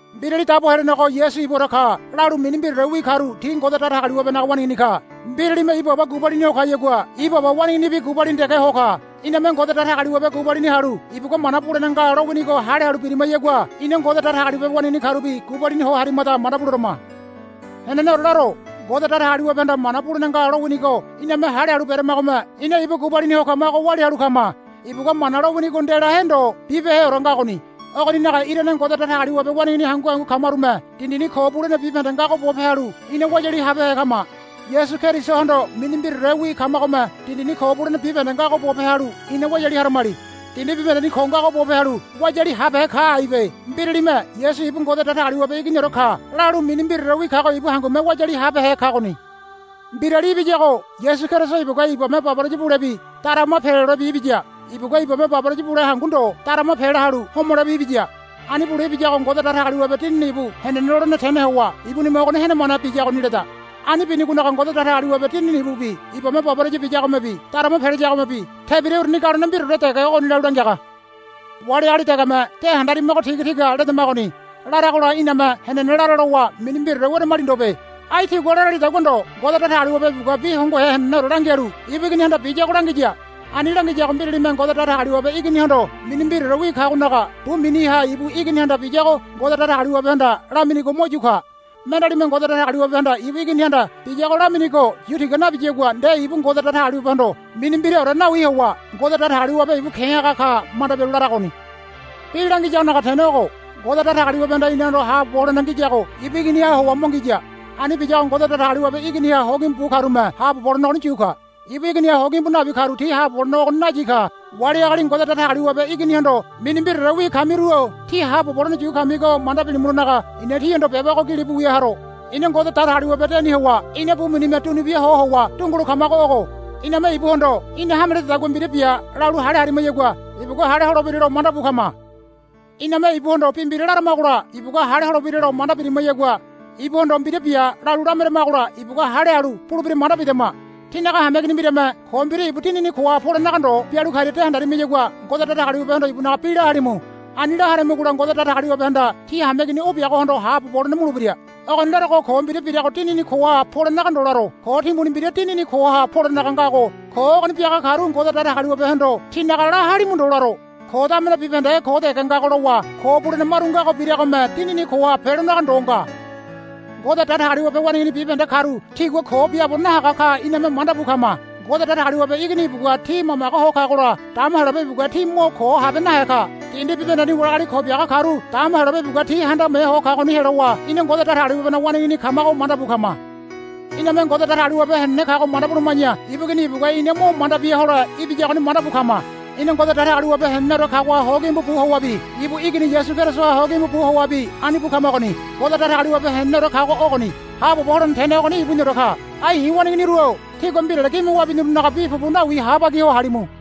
Mbirali Dabo Helenego Yasu ibuore ka, lalu mini mbiraorewi karu ti Ngode Datagaliwabenaga waneigini ka. Mbiralime ibu aba gubalini ho kayagua ibu aba waneiginibi gubalini dege ho ka. Iname Ngode Datagaliwabe gubalini halu ibugua mana bulene nga lowinigo hale halu birimayagua ina Ngode Datagaliwabe waneigini karubi gubalini ho harimada manda buleberema. Heneneore laro. Ngode Datagaliwabehanda mana bulene nga lowinigo iname hale halu beramagome ina ibu gubalini ho kamago walia halu kama. Ibugua mana lowinigo ndelahe ndo bibeheore ngagoni. Ogoninaga irane Ngode Datagaliwabe waneigini hangu hangu kamarume dindini ko bulene bibahende ngago bope halu ina wayali habehe kama. Yasu Kerisohondo mini mbiraorewi kamagome dindini ko bulene bibahende ngago bope halu ina wayali haramali. Dindi bibahendeni ko ngago bope halu wayali habehe ka aibe. Mbiralime, Yasu ibu Ngode Datagaliwabe Iginiore ka, lalu mini mbiraorewi kago ibu hangume wayali habehe kagoni. Mbirali ibiyago Yasu Keriso ibugua ibame baboraya bulebi darama pelolebi ibiya. Ibugua ibame baboraya bule hangu ndo darama pela halu homolebi ibiya. Ani bule ibiyago Ngode Datagaliwabe Dinini ibu henene lolene tene howa ibunime ogoni henemane biyagoni leda. Ani binigonaga Ngode Datagaliwabe Dinini ibubi ibame baboraya biyagomebi darama pelayagomebi tebira uruni galone mbiraore dege ogoni lalu langiaga. Wali agali degeme, De handarimago tigatiga ledamagoni, laragola iname, Henene lara, lowa mini mbiraore weramali ndobe. Ai tigua laralidagua ndo Ngode Datagaliwabe ibugua bi hongohe heneneore langialu ibu Iginihanda biyago langiya. Ani langiyago mbiralime Ngode Datagaliwabe Iginihondo mini mbiraorewi kagonaga bu miniha ibu Iginihanda biyago Ngode Datagaliwabehanda laminigo mo yu ka. Mendealime Ngode Datagaliwabehanda ibu Iginihanda biyago laminigo yu tiga nabiyagua nde ibu Ngode Datagaliwabehondo mini mbiraore nawi howa, Ngode Datagaliwabe ibu ke̱ haga ka, manda bialu laragoni. Bi langiyagonaga tene ogo. Ngode Datagaliwabehanda inahondo haabobo holene ngiyago ibu Iginiha howa mo ngiya. Ani biyago Ngode Datagaliwabe Iginiha hogimbu bu karume haabobo holene ogoni yu ka. Ibu Iginiha hogimbu nabi karu ti haabobo holene ogoni nayi ka. Wali agali Ngode Datagaliwabe Iginihondo mini mbiraorewi kamiru-o tí haabobo holene yu kamigo manda bilimulonaga i̱na tíhondo beba ogo gilibu wia haro. Ina Ngode Datagaliwabe deni howa ina bu minime dunubia ho howa dungulo kamago ogo. Iname ibuhondo, Í̠na hame lededagua mbira bia, lalu hale harimayagua ibugua hale holebiralo mandabu kama. Iname ibuhondo bi mbira laramagola ibugua hale holebiralo manda birimayagua ibuhondo, Mbira bia, lalu lameramagola ibugua hale halu bulebira manda bidama. Tínaga hameigini mbirame ko mbira ibu dinini koha polenaga ndo bialu karia de handarimiyagua Ngode Datagaliwabehondo ibunaga bi la halimu. Ani la haramigola Ngode Datagaliwabehanda tí hameigini o biagohondo haabobo holene mulebira. Ogoni larogo ko mbira birago dinini koha polenaga ndo laro. Ko timbuni mbira dinini koha polenaga ngago ko ogoni biaga karu Ngode Datagaliwabehondo tinaga la halimu ndo laro. Ko damene bibahende ko dege ngago lowa ko bulene maru ngago biragome dinini koha pelonaga ndo nga. Ngode Datagaliwabe waneigini bibahende karu tigua ko biaabo nahaga ka iname manda bu kama. Ngode Datagaliwabe Igini ibugua ti mamage ho kagola dama Heyolabe ibugua ti mo ko habe nahe ka. Dindi bibahendeni wali agali ko biaga karu dama Heyolabe ibugua ti handame ho kagoni helowa ina Ngode Datagaliwabenaga waneigini kamago mandabu kama. Iname Ngode Datagaliwabe henene kago manda buluma̱ya ibu Igini ibugua ina mo manda bia hole ibiyagoni mandabu kama. Ina Ngode Datagaliwabe heneneore kagoha hogimbu bu howabi ibu Igini Yasu Kerisoha hogimbu bu howabi ani bu kamagoni. Ngode Datagaliwabe heneneore kago ogoni. Haabobo holene tene ogoni ibuniore ka. Ai i̱ waneiginiru-o tígua mbirale gime wabinirunaga bi pupu nawi habagi ho halimu.